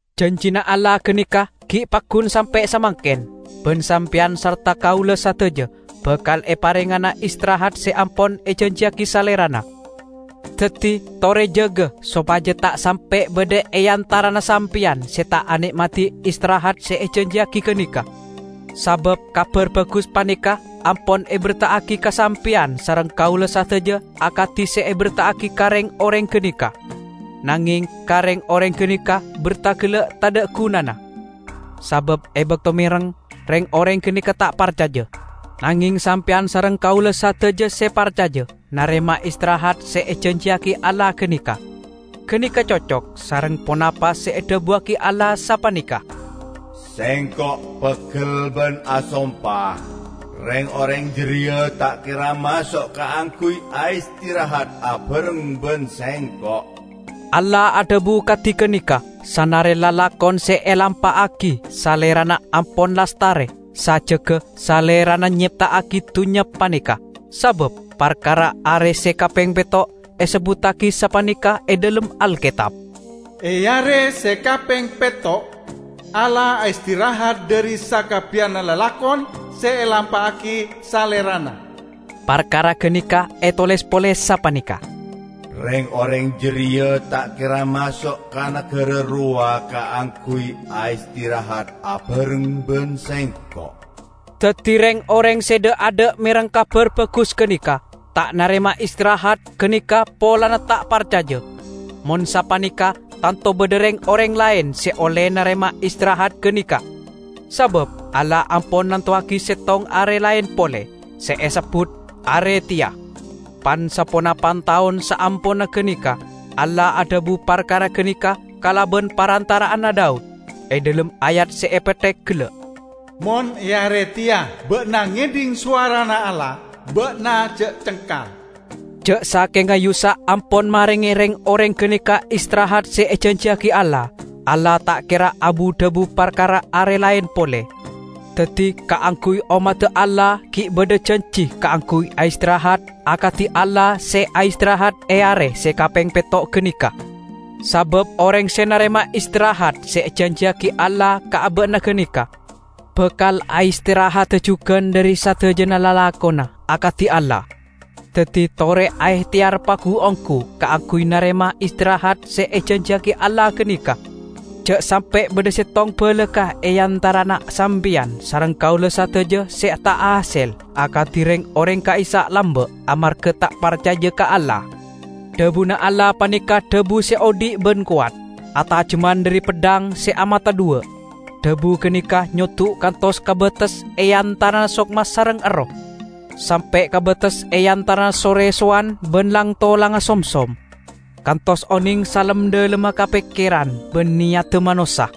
Janjina Allah ganeka gi' paggun sampe' samangken, ban sampeyan sarta kaula sadaja bakal eparengngana istirahat se ampon ejanjiyagi Salerana. Daddi tore jaga sopaja ta' sampe' badha e antarana sampeyan se ta' ane'madi istirahat se ejanjiyagi ganeka. Sabab Kabar Bagus paneka ampon eberta'agi ka sampeyan sareng kaula sadaja akadi se aberta'agi ka reng-oreng ganeka. Nangeng ka reng-oreng ganeka berta gella' tadha' gunana. Sabab e bakto mereng, reng-oreng ganeka ta' parcaja. Nangeng sampeyan sareng kaula sadaja se parcaja narema istirahat se ejanjiyagi Allah ganeka. Ganeka cocok sareng ponapa se edhabuwagi Allah, sapaneka, "Sengko' peggel ban asompa, 'Reng-oreng jareya ta' kera maso' kaangguy aistirahat abareng ban Sengko'.' " Allah adhabu kadi ganeka sanare lalakon se elampa'agi Salerana ampon lastare sajjegga Salerana nyepta'agi dunnya paneka. Sabab parkara are se kapeng petto', esebbuttagi sapaneka e dhalem Alketab, "E are se kapeng petto' Allah aistirahat dhari sakabbiyanna lalakon se elampa'agi Salerana." Parkara ganeka etoles pole sapaneka, "Reng-oreng jareya ta' kera maso' ka nagara rowa kaangguy aistirahat abareng ban Sengko'." Daddi reng-oreng se dha'-adha' mereng Kabar Bagus ganeka, ta' narema istirahat ganeka polana ta' parcaja. Mon sapaneka tanto badha reng-oreng laen se olle narema istirahat ganeka. Sabab Allah ampon nantowagi settong are laen pole, se esebbut "Are Teya". Pan-saponapan taon saamponna ganeka Allah adhabu parkara ganeka kalaban parantara'anna Daud, e dhalem ayat se epetthek gella', "Mon e are teya ba'na ngedhing sowarana Allah, ba'na ja' cengkal." Ja' sakenga Yusak ampon marenge reng-oreng ganeka istirahat se ejanjiyagi Allah, Allah ta' kera abu-dhabu parkara are laen pole. Daddi, kaangguy ommadda Allah gi' badha janji kaangguy aistirahat akadi Allah se aistirahat e are se kapeng petto' ganeka. Sabab oreng se narema istirahat se ejanjiyagi Allah ka aba'na ganeka, bakal aistirahada jugan dhari sadajana lalakonna, akadi Allah. Daddi, tore aehteyar pagu-onggu kaangguy narema istirahat se ejanjiyagi Allah ganeka. Ja' sampe' badha settong balakka' e antarana sampeyan sareng kaula sadaja se ta' ahasel akadi reng-oreng ka'issa' lamba' amarga ta' parcaja ka Allah. Dhabuna Allah paneka dhabu se odhi' ban kowat, atajemman dhari peddhang se amata dhuwa'. Dhabu ganeka nyoddu' kantos ka bates e antarana sokma sareng erroh; sampe' ka bates e antarana so-resowan ban lang-tolangnga somsom, kantos oneng salem-dhalemma ka pekkeran ban neyadda manossa.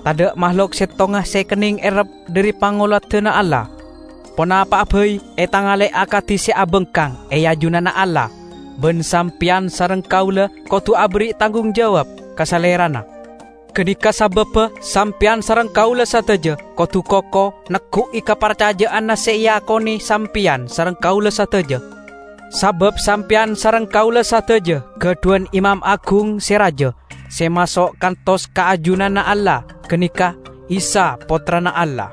Tadha' mahlok settonga se ekenneng errep dhari pangoladanna Allah. Ponapa'a bai etangale akadi se abangkang e ajunanna Allah. Ban sampeyan sareng kaula kodu aberri' tanggung jawab ka Salerana. Ganeka sababba sampeyan sareng kaula sadaja kodu koko neggu'i kaparcaja'anna se eakone sampeyan sareng kaula sadaja. Sabab sampeyan sareng kaula sadaja gadhuwan Imam Agung se raja, se maso' kantos ka ajunanna Allah -- ganeka Isa Pottrana Allah.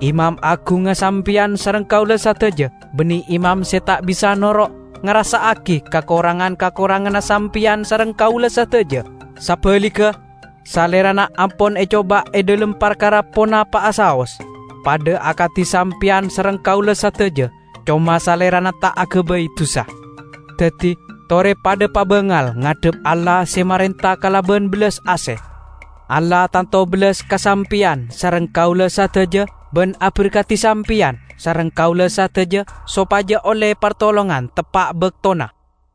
Imam Agungnga sampeyan sareng kaula sadaja banne imam se ta' bisa noro' ngarassa'agi kakorangan-kakoranganna sampeyan sareng kaula sadaja. Sabaligga, Salerana ampon ecoba e dhalem parkara ponapa'a saos, padha akadi sampeyan sareng kaula sadaja; coma Salerana ta' agabay dusa! Daddi, tore padha pabangal ngadhep Allah se marenta kalaban bellas ase. Allah tanto bellas ka sampeyan sareng kaula sadaja ban aberkadi sampeyan sareng kaula sadaja sopaja olle partolongan teppa' baktona.